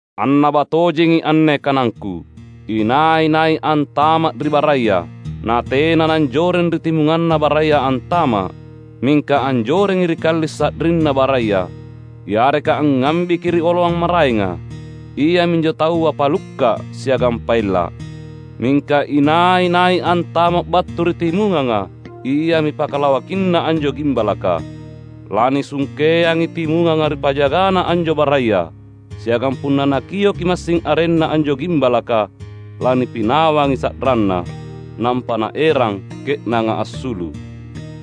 "Annaba tojengi anne kanangKu: Inai-nai antama’ ri baraya natena nanjoreng ri timunganna baraya antama’, mingka anjorengi ri kalli’ sa’rinna baraya, yareka angngambiki ri oloang maraenga, iaminjo taua pallukka’ siagang paella’. Mingka inai-nai antama’ battu ri timunganga iami pakalawakinna anjo gimbalaka. Lanisungkeangi timunganga ri pajagana anjo baraya; siagang punna nakioki massing arenna anjo gimbalaka, lanipinawangi sa’ranna, nampa naerang ke’nanga assulu’.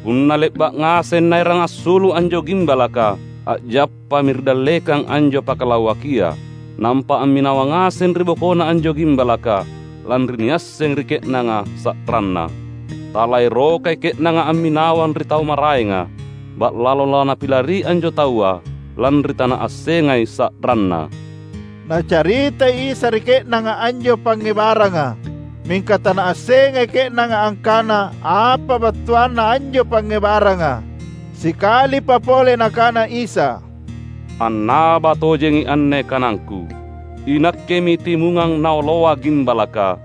Punna le’ba’ ngaseng naerang assulu’ anjo gimbalaka, a’jappami ri dallekang anjo pakalawakia; nampa amminawang ngaseng ri bokona anjo gimbalaka, lanri niassengi ri ke’nanga sa’ranna. Talaerokai ke’nanga amminawang ri tau maraenga; ba’lalo lanapilari anjo taua, lanri tanaassengai sa’ranna." Nacaritai Isa ri ke’nanga anjo pangngebaranga, mingka tanaassengai ke’nanga angkana apa battuanna anjo pangngebaranga. Sikalipa pole Nakana Isa, "Annaba tojengi anne kanangKu: INakkemi timungang naoloa gimbalaka.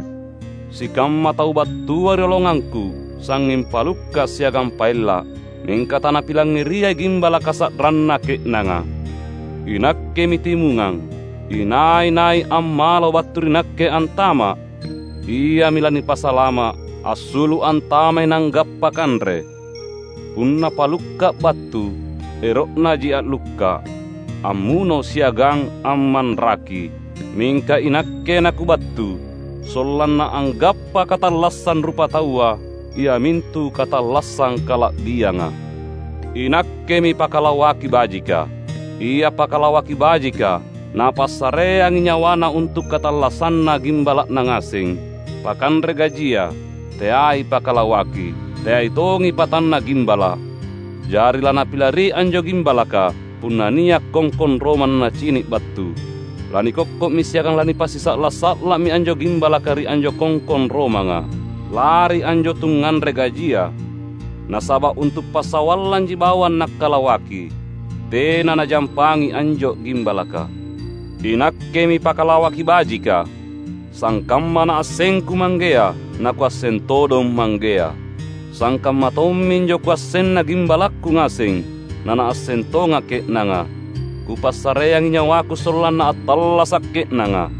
Sikamma tau battua rioloangangKu sangnging palukka’ siagang paella’; mingka tanapilangngeriai gimbalaka sa’ranna ke’nanga. INakkemi timungang. Inai-nai ammalo battu ri Nakke antama’, iami lanipasalama’; assulu’ antamai nanggappa kanre. Punna palukka’ battu, ero’naji a’lukka’, ammuno siagang ammanraki. Mingka iNakke naKubattu, sollanna anggappa katallassang rupataua iamintu katallassang kala’bianga. INakkemi pakalawaki bajika. Ia pakalawaki bajika, napassareangi nyawana untu’ katallassanna gimbala’na ngaseng. Pakanre gajia, teai pakalawaki, teai tongi patanna gimbala’; jari lanapilari anjo gimbalaka punna nia’ kongkong romang nacini’ battu. Lanikokko’mi siagang lanipasisa’la’-sa’la’mi anjo gimbalaka ri anjo kongkong romanga. Lari anjo tungnganre gajia, nasaba’ untu’ passawallanji bawang nakkalawaki. Tena najampangi anjo gimbalaka. INakkemi pakalawaki bajika. Sangkamma NaassengKu Manggea na Kuasseng todong Manggea, sangkamma tomminjo Kuassenna gimbalakKu ngaseng, na naasseng tongA’ ke’nanga. Kupassareangi nyawaKu sollanna attallasa’ ke’nanga.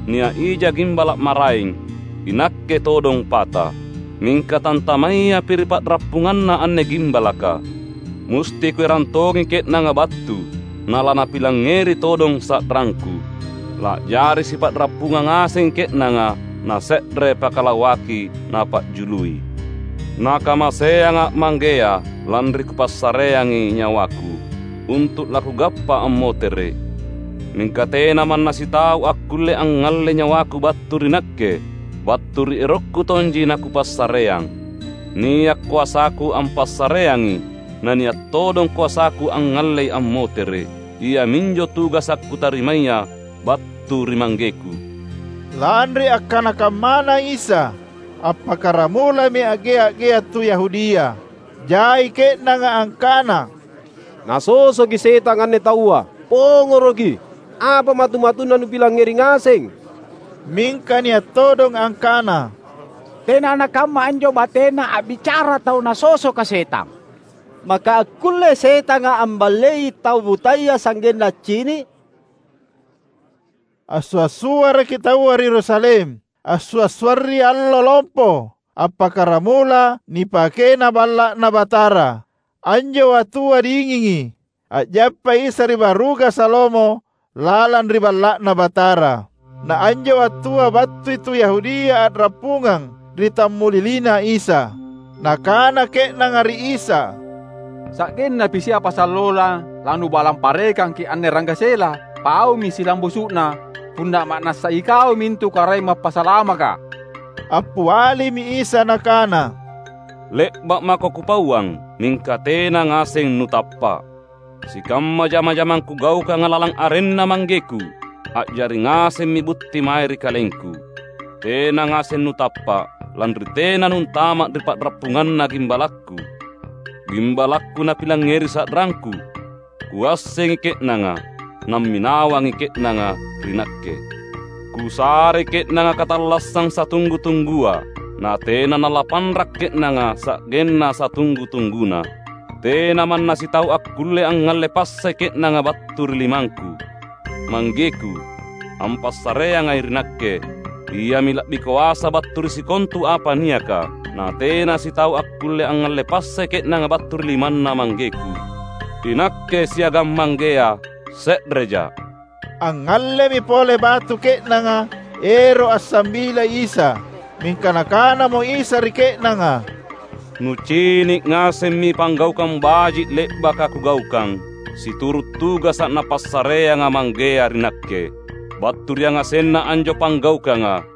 Nia’ ija gimbala’ maraeng, iNakke todong pata, mingka tantamayapi ri pa’rappunganna anne gimbalaka. Musti Kuerang tongi ke’nanga battu na lanapilangngeri todong sa’rangKu. La’jari sipa’rappungang ngasengi ke’nanga na se’re pakalawaki napa’jului. NakamaseangA’ Manggea, lanri Kupassareangi nyawaKu, untu’ laKugappa ammotere’. Mingka tena manna sitau akkulle angngallei nyawaKu battu ri Nakke. Battu ri erokKu tonji naKupassareang. Nia’ koasaKu ampassareangi, na nia’ todong koasaKu angngallei ammotere’. Iaminjo tugasa’ Kutarimaya battu ri ManggeKu." Lanri akkana kammana Isa, appakkaramulami a’gea’-gea’ tu Yahudia. Jai ke’nanga angkana, "Nasosoki setang anne taua. Pongoroki! Apa matu-matunna nupilangngeri ngaseng?" Mingka nia’ todong angkana, "Tena nakamma anjo batena a’bicara tau nasosoka setang! Maka akkullei setanga amballei tau butaya sa’genna accini’?" Assua’-suaraki taua ri Yerusalem ansua’-suarri Allo Lompo Appakkaramula nipakena Balla’Na Batara. Anjo wattua dingingi. A’jappai Isa ri baruga Salomo lalang ri Balla’Na Batara; na anjo wattua battui tu Yahudia a’rappungang ri tammuliliNa Isa. Nakana ke’nanga ri Isa, "Sa’gennapi siapa sallona laNubalang parekangki’ anne ranggasela? Paumi silambusu’na, punna ma’nassa iKau mintu Karaeng Mappasalamaka." Appialimi Isa Nakana, "Le’ba’ mako Kupauang, mingka tena ngaseng nutappa’. Sikamma jama-jamang Kugaukanga lalang arenNa ManggeKu, a’jari ngasemmi butti mae ri KalengKu. Tena ngaseng nutappa’, lanri tena nuntama’ ri pa’rappunganna gimbalakKu. GimbalakKu napilangngeri sa’rangKu. Kuassengi ke’nanga, namminawangi ke’nanga ri Nakke. Kusarei ke’nanga katallassang satunggu-tunggua, natena nalapanra’ ke’nanga sa’genna satunggu-tungguna. Tena manna sitau akkulle angngalle passai ke’nanga battu ri limangKu. ManggeKu, ampassareangai ri Nakke, Iami la’bi koasa battu ri sikontu apa niaka. Na tena sitau akkulle angngalle passai ke’nanga battu ri limanNa ManggeKu. INakke siagang Manggea se’rejA’." Angngallemi pole batu ke’nanga ero’ ansambilai Isa. Mingka Nakanamo Isa ri ke’nanga, "Nucini’ ngasemmi panggaukang baji’ le’baka Kugaukang, situru’ tugasa’ Napassareanga Manggea ri Nakke. Battu ri yangasenna anjo panggaukanga,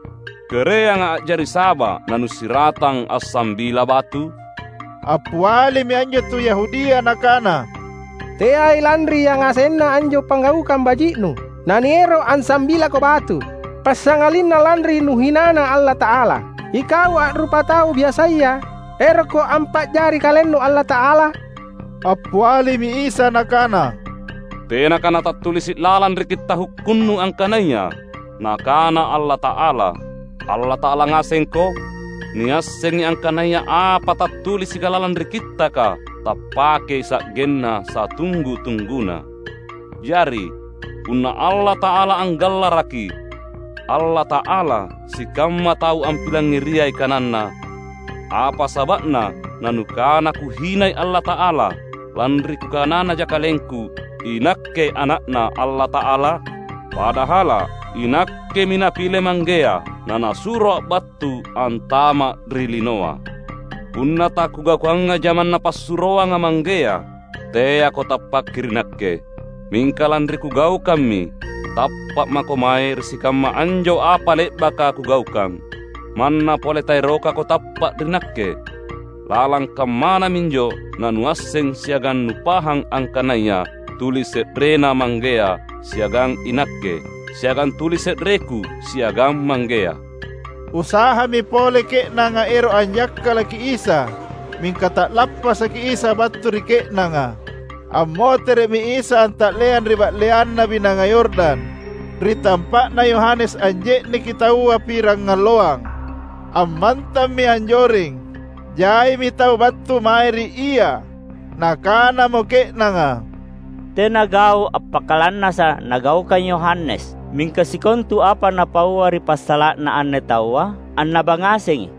kereanga a’jari saba’ nanusiratang ansambilA’ batu?" Appialimi anjo tu Yahudia nakana, "Teai lanri yangasenna anjo panggaukang baji’Nu naniero’ ansambilaKo batu, passangalinna lanri Nuhinana Allata’ala. Ikau a’rupatau biasaya, erokKo ampa’jari KalenNu Allata’ala?" Appialimi Isa Nakana, "Tenaka natattulisi’ lalang ri Kitta’ Hukkunnu angkanaya: Nakana Allata’ala, ‘allata’ala ngasengko’? Niassengi angkanaya apa tattulisika lalang ri Kittaka tappakei sa’genna satunggu-tungguna. Jari, punna Allata’ala anggallaraki ‘allata’ala’ sikamma tau ampilangngeriai kananNa, apa saba’na nanukana Kuhinai Allata’ala lanri Kukananaja KalengKu iNakke Ana’Na Allata’ala? Padahala’ iNakkemi Napile Manggea na NasuroA’ battu antama’ ri linoa. Punna taKugaukanga jamang Napassuroanga Manggea, teako tappaki ri Nakke. Mingka lanri Kugaukammi, tappa’ mako mae ri sikamma anjo apa le’baka Kugaukang, manna pole taerokako tappa’ ri Nakke. Lalang kammana minjo nanuasseng siagang nupahang angkanaya tuli se’rena Manggea siagang iNakke, siagang tuli se’reKu siagang Manggea." Usahami pole ke’nanga ero’ anjakkalaki Isa, mingka ta’lappasaki Isa battu ri ke’nanga. Ammotere’mi Isa anta’leang ri ba’leanna Binanga Yordan, ri tampa’na Yohanes anje’neki taua pirangalloang. Ammantammi anjoreng. Jaimi tau battu mae ri Ia. Nakanamo ke’nanga, "Tena gau’ appakalannasa’ nagaukang Yohanes, mingka sikontu apa napaua ri passala’na anne Taua annaba ngasengi."